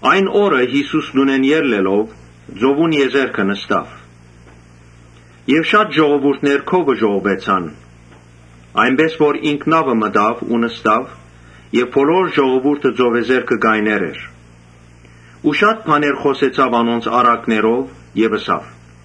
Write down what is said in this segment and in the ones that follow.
Այն օրը Յիսուս տունէն ելլելով ծովուն եզերքը նստաւ։ Շատ ժողովուրդ քովը ժողովուեցան, այնպէս որ ինք նաւը մտաւ ու նստաւ եւ բոլոր ժողովուրդը ծովեզերքը կայներ էր։ Շատ բաներ խօսեցաւ անոնց առակներով եւ ըսաւ.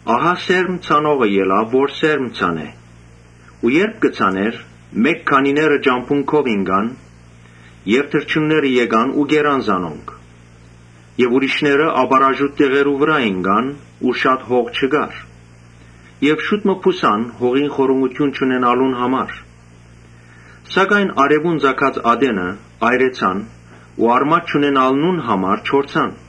«Ահա սերմ ցանողը ելաւ որ սերմ ցանէ։ Երբ կը ցանէր, մէկ քանիները ճամբուն քով ինկան եւ թռչունները եկան ու կերան զանոնք։ Ուրիշներ ապառաժուտ տեղերու վրայ ինկան, ուր շատ հող չկար եւ շուտ մը բուսան՝ հողին խորունկութիւն չունենալուն համար. Սակայն արեւուն ծագած ատենը այրեցան ու արմատ չունենալուն համար չորցան։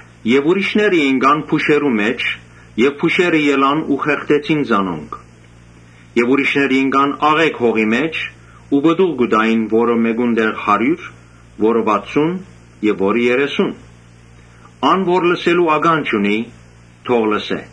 Ուրիշներ ինկան փուշերու մէջ։ Փուշերը ելան ու խեղդեցին զանոնք։ Ուրիշներ ինկան աղէկ հողի մէջ ու պտուղ տուին ո՛րը մէկուն տեղ հարիւր, ո՛րը՝ վաթսուն եւ ո՛րը՝ երեսուն։ Ան որ լսելու ականջ ունի՝ թող լսէ»։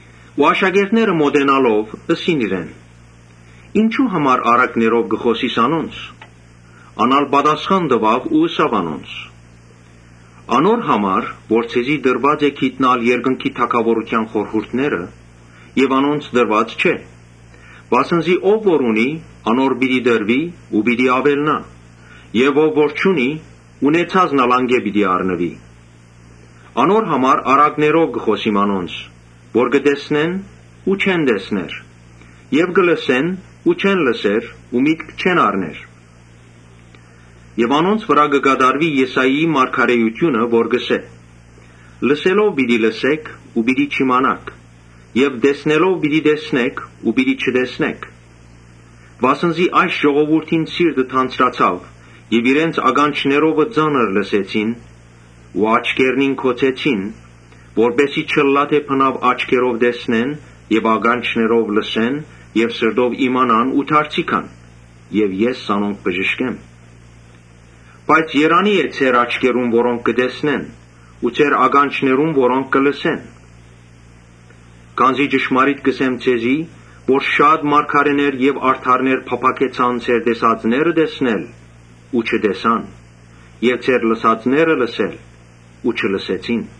Աշակերտները մօտենալով՝ ըսին իրեն. «Ինչո՞ւ համար առակներով կը խօսիս անոնց»։ Ան ալ պատասխան տուաւ ու ըսաւ անոնց. «Անոր համար՝ որ ձեզի տրուած է գիտնալ երկնքի թագաւորութեան խորհուրդները, բայց անոնց տրուած չէ։ Վասն զի ով որ ունի, անոր պիտի տրուի ու պիտի աւելնայ եւ ով որ չունի, ունեցածն ալ անկէ պիտի առնուի։ Անոր համար առակներով կը խօսիմ անոնց, որ կը տեսնեն՝ ու չեն տեսներ եւ կը լսեն՝ ու չեն լսեր ու միտք չեն առներ։ Անոնց վրայ պիտի կատարուի Եսայի մարգարէութիւնը որ կ’ըսէ. ‘Լսելով պիտի լսէք ու պիտի չիմանաք։ Տեսնելով պիտի տեսնէք ու պիտի չտեսնէք’։ Վասն զի այս ժողովուրդին սիրտը թանձրացաւ եւ իրենց ականջներովը ծանր լսեցին ու աչքերնին գոցեցին, որպէս զի չըլլայ թէ աչքերով տեսնեն եւ ականջներով լսեն եւ սրտով իմանան ու դարձի գան եւ ես զանոնք բժշկեմ։ Բայց երանի՜ է ձեր աչքերուն, որոնք կը տեսնեն ու ձեր ականջներուն, որոնք կը լսեն, Քանզի ճշմարիտ կ’ըսեմ ձեզի, թէ շատ մարգարէներ եւ արդարներ փափաքեցան ձեր տեսածները տեսնել ու չտեսան եւ ձեր լսածները լսել՝ ու չլսեցին»։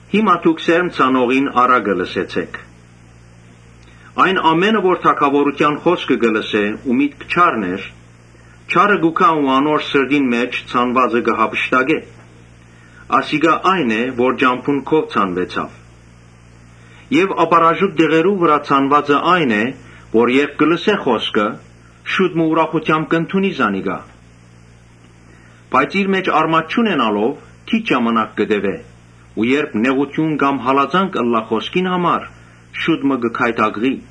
«Հիմա դուք սերմ ցանողին առակը լսեցիք։ Ամէն ով որ թագաւորութեան խօսքը կը լսէ ու միտք չառներ, չարը կու գայ ու անոր սրտին մէջ ցանուածը կը յափշտակէ։ Ասիկա այն է որ ճամբուն քով ցանուեցաւ։ Ապառաժուտ տեղերու վրայ ցանուածը այն է որ երբ լսէ խօսքը, շուտ մը ուրախութեամբ կ’ընդունի զանիկա։ Բայց իր մէջ արմատ չունենալով, քիչ ժամանակ կը տեւէ ու երբ նեղութիւն կամ հալածանք ըլլայ խօսքին համար, շուտ մը կը գայթակղի։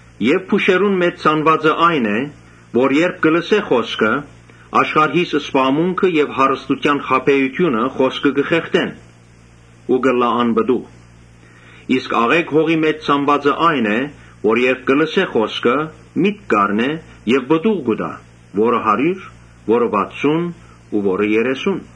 Փուշերուն մէջ ցանուածը այն է որ երբ կը լսէ խօսքը, աշխարհիս զբաղմունքը եւ հարստութեան խաբէութիւնը խօսքը կը խեղդեն ու կ’ըլլայ անպտուղ, Իսկ աղէկ հողի մէջ ցանուածը այն է որ երբ լսէ խօսքը, միտք կ’առնէ եւ պտուղ կու տայ, ո՛րը հարիւր, ո՛րը՝ վաթսուն ու ո՛րը՝ երեսուն»,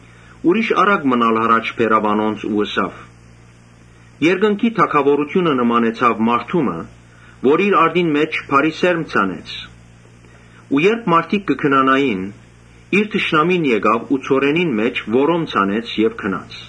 Ուրիշ առակ մըն ալ յառաջ բերաւ անոնց ու ըսաւ. «Երկնքի թագաւորութիւնը նմանեցաւ մարդու մը, որ իր արտին մէջ բարի սերմ ցանեց։ Երբ մարդիկ կը քնանային իր թշնամին եկաւ ու ցորենին մէջ որոմ ցանեց եւ գնաց։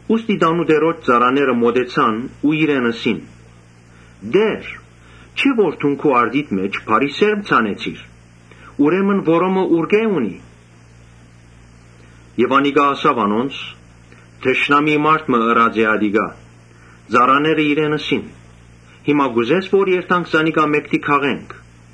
Ուստի տանտիրոջ ծառաները մօտեցան ու իրեն ըսին. ‘Տէ՛ր, չէ՞ որ դուն քու արտիդ մէջ բարի սերմ ցանեցիր. ուրեմն որոմը ուրկէ՞ է’։ Անիկա ըսաւ անոնց. ‘Թշնամի մարդ մը ըրած է ատիկա’։ Ծառաները իրեն ըսին. ‘Հիմա կ’ուզե՞ս որ երթանք զանոնք քաղենք’։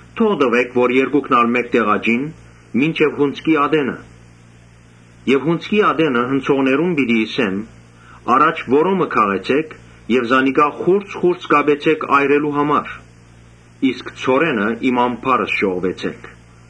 Թող տուէ՛ք որ երկուքն ալ մէկտեղ աճին մինչեւ հունձքի ատենը։ Եւ հունձքի ատենը հնձողներուն պիտի ըսեմ. ‘Առաջ որոմը քաղեցէք, խուրձ խուրձ կապեցէք այրելու համար, իսկ ցորենը իմ ամբարս ժողվեցէք’»։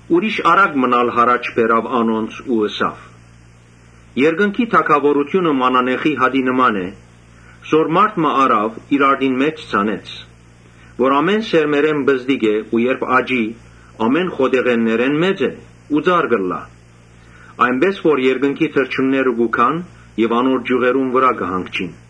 Ուրիշ առակ մըն ալ յառաջ բերաւ անոնց ու ըսաւ. «Երկնքի թագաւորութիւնը մանանեխի հատի նման է, որ մարդ մը առաւ, իր արտին մէջ ցանեց։ Ան՝ բոլոր սերմերէն պզտիկ է, բայց երբ աճի, բոլոր խոտեղէններէն մեծ ծառ կ’ըլլայ, այնպէս որ երկնքի թռչունները կու գան եւ անոր ճիւղերուն վրայ կը հանգչին»։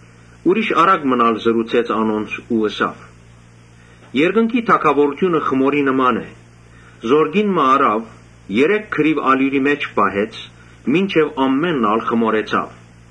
Ուրիշ առակ մըն ալ ըսաւ անոնց. «Երկնքի թագաւորութիւնը խմորի նման է, որ կին մը առաւ, երեք գրիւ ալիւրի մէջ պահեց մինչեւ բոլորն ալ խմորուեցաւ»։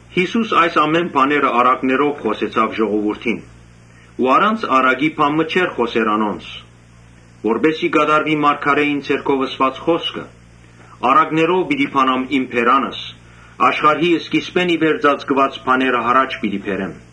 Յիսուս այս ամէն բաները առակներով խօսեցաւ ժողովուրդին։ Առանց առակի բան մը չէր խօսեր անոնց, Որպէս զի կատարուի մարգարէին միջոցով ըսուած խօսքը. «Առակներով պիտի բանամ իմ բերանս ու աշխարհի սկիզբէն ի վեր ծածկուած բաները յառաջ պիտի բերեմ»։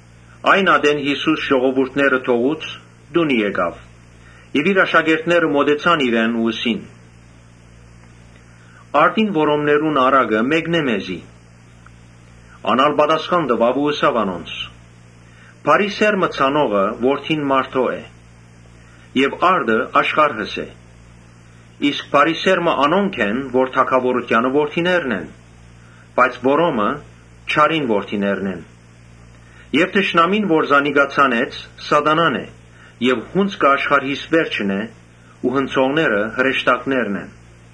Երբ Յիսուս ժողովուրդը թողուց, տունը գնաց։ Իր աշակերտները մօտեցան իրեն ու ըսին. «Արտին որոմներուն առակը մեկնէ մեզի»։ Ան ալ պատասխան տուաւ ու ըսաւ անոնց. «Բարի սերմը ցանողը Որդին մարդոյ է. Արտը աշխարհս է։ Բարի սերմը թագաւորութեանը որդիներն են, բայց որոմը չարին որդիներն են։ Թշնամին որ զանիկա ցանեց, Սատանան է եւ հունձքը աշխարհիս վերջն է ու հնձողները հրեշտակներն են։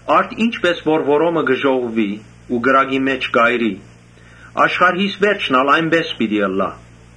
Արդ ինչպէս որ որոմը կը ժողվուի ու կրակի մէջ կ’այրուի, աշխարհիս վերջն ալ այնպէս պիտի ըլլայ։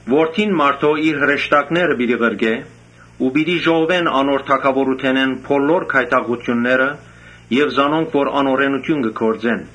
Որդին մարդոյ իր հրեշտակները պիտի ղրկէ ու պիտի ժողվեն անոր թագաւորութենէն բոլոր գայթակղութիւնները եւ զանոնք, որ անօրէնութիւն կը գործեն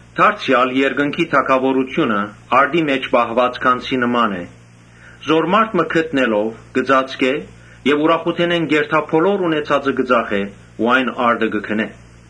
«Դարձեալ երկնքի թագաւորութիւնը արտի մէջ պահուած գանձի մը նման է, որ մարդ մը գտնելով՝ կը ծածկէ եւ ուրախութենէն կ’երթայ բոլոր ունեցածը կը ծախէ ու այն արտը կը գնէ»։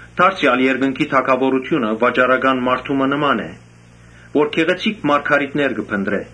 «Դարձեալ երկնքի թագաւորութիւնը վաճառական մարդու մը նման է, որ գեղեցիկ մարգարիտներ կը փնտռէ.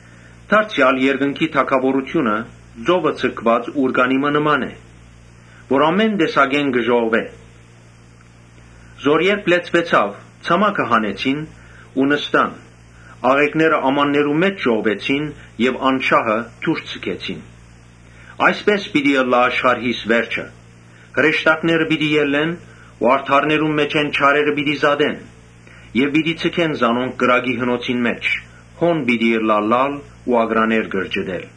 «Դարձեալ երկնքի թագաւորութիւնը ծովը ձգուած ուռկանի մը նման է, որ ամէն տեսակ ձուկ կը ժողվէ։ Երբ ուռկանը լեցուեցաւ, ցամաքը հանեցին ու նստան աղէկները ամաններու մէջ ժողվեցին եւ անշահը դուրս ձգեցին։ Այսպէս պիտի ըլլայ աշխարհիս վերջը։ Հրեշտակները պիտի ելլեն ու արդարներուն մէջէն չարերը պիտի զատեն. Եւ պիտի ձգեն զանոնք կրակի հնոցին մէջ, հոն պիտի ըլլայ լալ ու ակռաներ կրճտել»։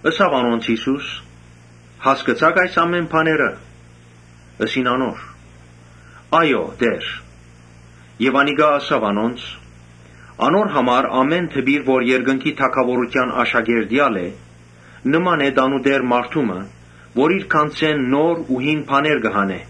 Ըսաւ անոնց Յիսուս. «Հասկցա՞ք այս ամէն բաները»։ Ըսին անոր. «Այո՛, Տէ՛ր»։ Անիկա ըսաւ անոնց. «Անոր համար ամէն դպիր որ երկնքի թագաւորութեան աշակերտ եղած է, նման է տանտէր մարդու մը որ իր գանձէն նոր ու հին բաներ կը հանէ»։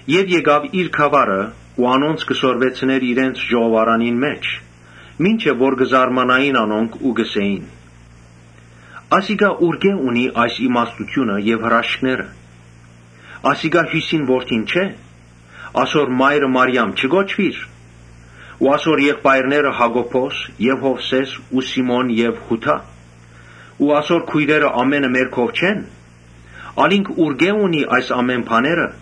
Եւ գնաց իր գաւառը ու անոնց կը սորվեցնէր իրենց ժողովարանին մէջ, անոնք ալ կը զարմանային ու կ’ըսէին. «Ասիկա ուրկէ՞ ունի այս իմաստութիւնը եւ հրաշքները։ Ասիկա հիւսնին որդին չէ՞. ասոր մայրը Մարիամ չի՞ կոչուիր։ Ասոր եղբայրները՝ Յակոբոս եւ Յովսէս ու Սիմոն եւ Յուդա. Ու ասոր քոյրերը ամէնքը մեր քով չե՞ն։ Ալ ինք ուրկէ՞ ունի այս ամէն բաները»։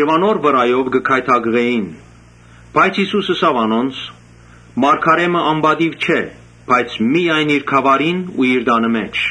Անոր վրայով կը գայթակղէին. բայց Յիսուս ըսաւ անոնց. «Մարգարէ մը անպատիւ չէ, բայց միայն իր գաւառին ու իր տանը մէջ»։